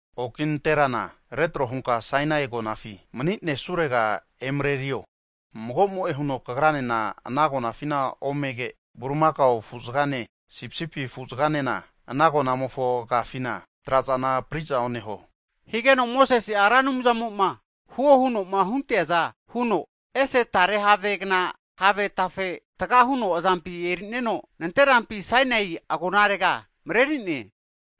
Oki nanterana retro hunka Sainai agonafi mani'nesurega emarerio. Magomo'e huno kagranena ana agonafina omege, bulimakao afu'zagane sipisipi afu'zaganena ana agonamofo agafina trazana apri'za oneho. Higeno Mosese'a Ra Anumzamo'ma huo huno'ma hunteaza huno, ese tare havegna have tafe taga huno azampi e'nerino, nanterampi Sainai agonarega mareri'ne.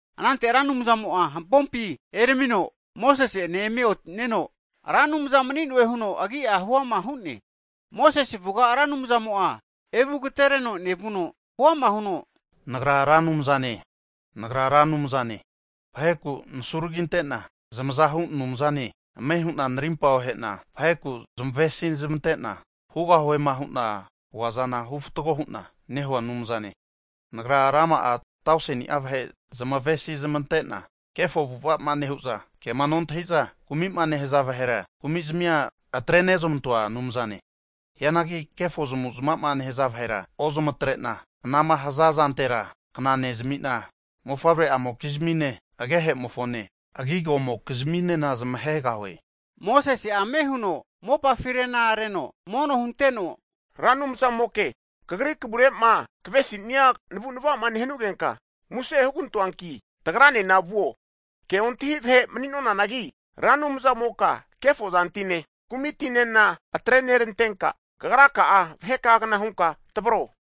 Anante Anumzamo'a hampompi eramino Mosese ene eme oti'neno, Ra Anumza mani'noe huno agi'a huama hu'ne. Mosese avuga Ra Anumzamo'a evu agatereno nevuno, huama huno Nagra Ra Anumzane, Nagra Ra Anumzane, vaheku nasuraginte'na zmazahu Anumzane. Ame hu'na narimpa ohe'na, vaheku zmavesi zmante'na hugahuema hu'nama huaza hufatgo hu'na nehua Anumzane. Nagra rama'a tauseni'a vahe zamavesi zmante'na, kefo avu'ava'ma nehu'za, kema nontahi'za kumi'ma nehaza vahera kumi'zmia atrenezamantoa Anumzane. Hianagi kefo zamavu'zmavama nehaza vahera ozamatre'na, anama haza zantera kna nezami'na, mofavre'amokizmine agehemofone agigomokizminena zmahegahue. Mosese'a ame huno mopafi arena reno mono hunteno, Ra Anumzamoke, Kagri kavure'ma kavesi'nea navu'nava'ma nehanugenka, muse hugantoanki tagranena vuo, ke ontahi vahe mani'nonanagi Ra Anumzamoka kefozantine kumitinena atrenerantenka, kagraka'a vaheka'agna hunka tavro.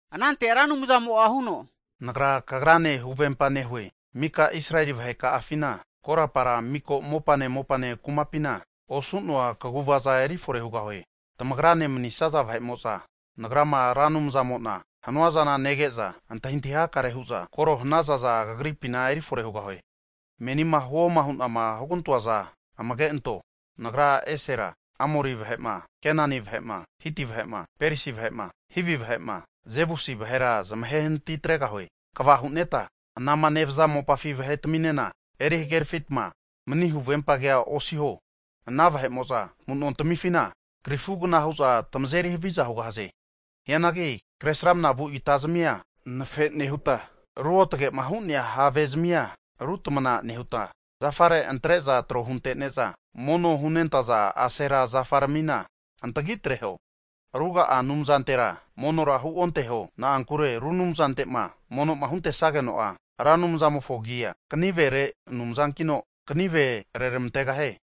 Anante Ra Anumzamo'a huno, Nagra kagrane huvempa nehue, mika Israeli vaheka'afina korapara mika mopane mopane kumapina osu'noa kaguvaza erifore hugahue. Tamagrane manisaza vahe'mo'za Nagrama Ra Anumzamo'na hanuazana nege'za antahintahi hakare hu'za koro hanazaza kagripina eri fore hugahue. Menina huoma hu'na hugantoaza amage anto. Nagra esera Amori vahe'ma, Kenani vahe'ma, Hiti vahe'ma, Perisi vahe'ma, Hivi vahe'ma, Jebusi vahera zamahenati atregahue. Kva hu'neta anama nevaza mopafi vahetaminena eri hagerafitma mani huvempa kea osiho. Ana vahe'mo'za amu'nontamifina krifugna hu'za tamazeri haviza hugahaze. Hianagi kresramnavu itazmia anafe nehuta ruotage'ma hu'nea havezmia rutamana nehuta zafare antre'za tro huntene'za mono hunentaza asera zafaramina antagitreho. Ruga'a anumzantera monora huonteho, na'ankure ru anumzante'ma mono'ma huntesageno'a Ra Anumzamofo agia kanivere Anumzankino, kanive reramantegahie.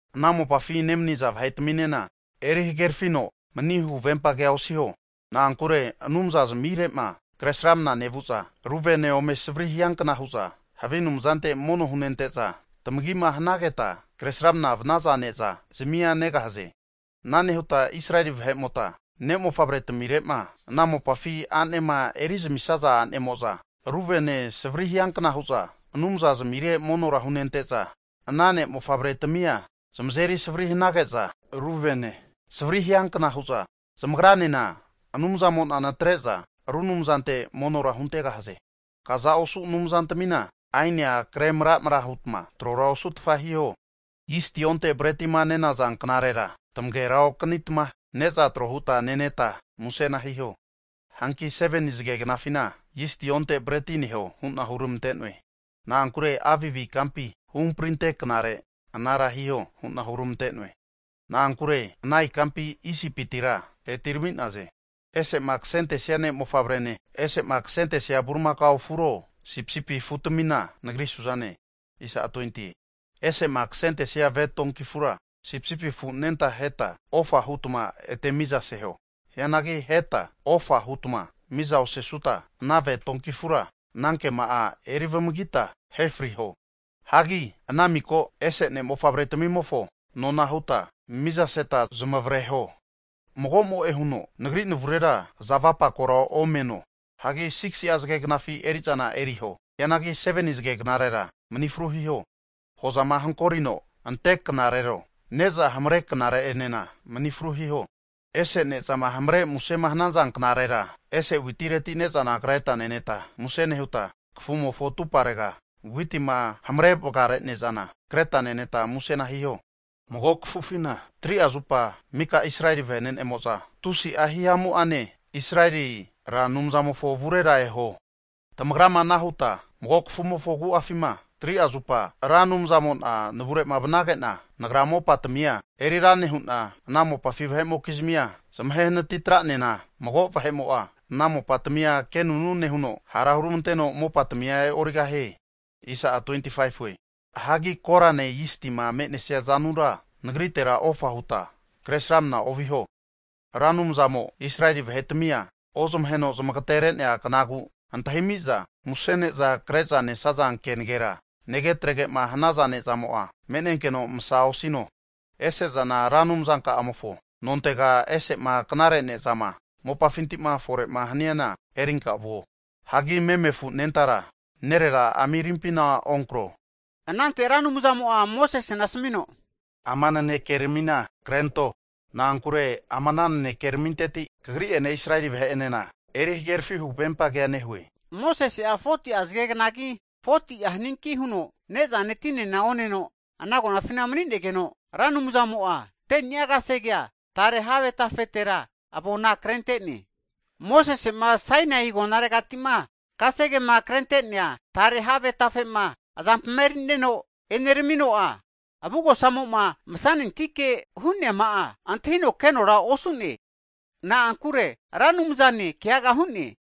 Ana mopafi nemaniza vahetaminena eri hagerafino mani huvempa kea osiho. Na'ankure anumzazmire'ma kresramna nevu'za, ru vene ome savri hiankna hu'za havi anumzante mono hunente'za, tamagima hanageta kresramna vanaza ne'za zamia negahaze. Ana nehuta Israeli vahe'mota ne'mofavretamire'ma ana mopafi a'nema erizamisaza a'nemo'za, ru vene savri hiankna hu'za anumzazmire monora hunente'za, ana ne'mofavretamia zamazeri savri hanage'za, ru vene savri hiankna hu'za zmagranena Anumzamo'na natre'za ru anumzante monora huntegahaze. Kaza osu anumzantamina aenia kre mra'mra hutma trora osutfa hiho. Zisti onte bretima nenaza knarera tamagera okanitma ne'za tro huta neneta musena hiho. Hanki 7ni'a zagegnafina zisti onte breti neho hu'na huramante'noe. Na'ankure Abib ikampi huhamprinte knare anara hiho hu'na huramante'noe. Na'ankure ana ikampi Isipitira etirami'naze. Ese'ma kasentesia ne'mofavrene, ese'ma kasentesia bulimakao afuro sipisipi afutamina, Nagri su'zane. Ese'ma kasentesia ve donki afura, sipisipi afu anenta aheta ofa hutma ete mizaseho. Hianagi aheta ofa hutma miza osesuta, ana ve donki afura anankema'a eri vamagita ahe friho. Hagi ana miko ese ne'mofavretamimofo nona'a huta mizaseta zamavareho. Mago'mo'e huno Nagri navurera aza avapakora omeno. Hagi 6si zage knafi eri'zana eriho. Hianagi 7ni zageknarera mani fru hiho. Hozama hagolino ante knarero, ne'za hamare knare enena mani fru hiho. Ese ne'zama hamare musema hanaza knarera, ese witireti ne'zana kreta neneta, musena nehuta kafumofo atuparega witima hamare vagare ne'zana kreta neneta musena hiho. Mago kafufina 3'a zupa mika Israeli vene'nemo'za tusi'a hihamu'ane Israeli Ra Anumzamofo avurera eho. Tamagrama ana huta mago kafumofo agu'afima 3'a zupama Ra Anumzamo'na navure'ma vanage'na, Nagra mopatamia erira nehu'na, ana mopafi vahe'mokizmia zamahe natitra'nena, mago vahe'mo'a ana mopatamia kenunu nehuno, hara huramanteno mopatamia e'origahie. Hagi korane zistima me'nesia zanura Nagritera ofa huta Kresramana oviho. Ra Anumzamo Israeli vahetamia ozmaheno zamagatere'nea knagu antahimiza, muse ne'za kre'za nesaza kenegera, nege'atrege'ma hanaza ne'zamo'a me'nenkeno masa osino. Ese zana Ra Anumzanka'amofo nontega ese'ma knare ne'zama mopafinti fore'ma haniana erinka vuo. Hagi meme afu anentara nerera amirimpina onkro. Anante Ra Anumzamo'a Mosesena asamino, Ama nanekeramina krento, na'ankure ama ana nanekeraminteti kagri'ene Israeli vahe'enena eri hagerafi huvempa kea nehue. Mosese'a 40'a zagegnagi 40'a haninki huno nezane tinena oneno ana agonafi maninegeno, Ra Anumzamo'a 10ni'a kasegea tare have tafetera avona krente'ne. Mosese'ma Sainai agonaregati'ma kasegema krente'nea tare have tafe'ma azampi eri'neno e'neramino'a, avugosamo'ma masanentike hu'nema'a antahinokenora osu'ne. Na'ankure Ra Anumzane keaga hu'ne.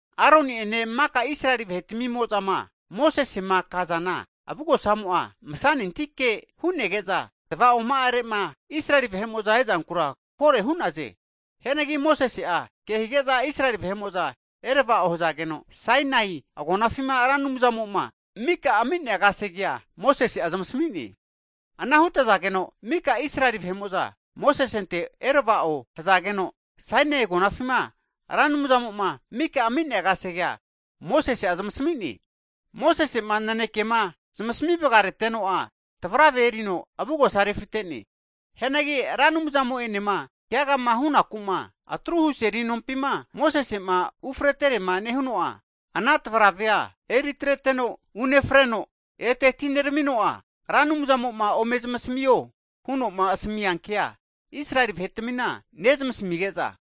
Aroni'ene mika Israeli vahetamimo'zama Mosesema kazana, avugosamo'a masanentike hu'nege'za, ta va'oma'are'ma Israeli vahe'mo'za e'zankura kore hu'naze. Hianagi Mosese'a ke hige'za Israeli vahe'mo'za erava'o hazageno, Sainai agonafima Ra Anumzamo'ma mika ami'nea kasegea Mosese'a zamasami'ne. Ana hutazageno, mika Israeli vahe'mo'za Mosesente erava'o hazageno, Sainai agonafima Ra Anumzamo'ma mika ami'nea kasegea Mosese'a zamasami'ne. Mosese'ma nanekema zmasami vagarete'noa tavrave erino avugosa refite'ne. Hianagi Ra Anumzamo'enema keagama hunaku'ma atruhu seli nompima Mosese'ma ufreterema nehuno'a, ana tavravea eritreteno unefreno, ete atineramino'a, Ra Anumzamo'ma ome zamasamio hu'noma asami'nea kea Israeli vahetamina nezmasamige'za,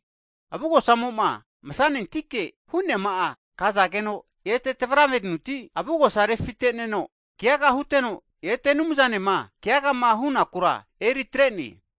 avugosamo'ma masanentike hu'neama'a kazageno, ete tavravenuti avugosa refite'neno keaga huteno, ete Anumzanema keagama hunakura eri atre'ne.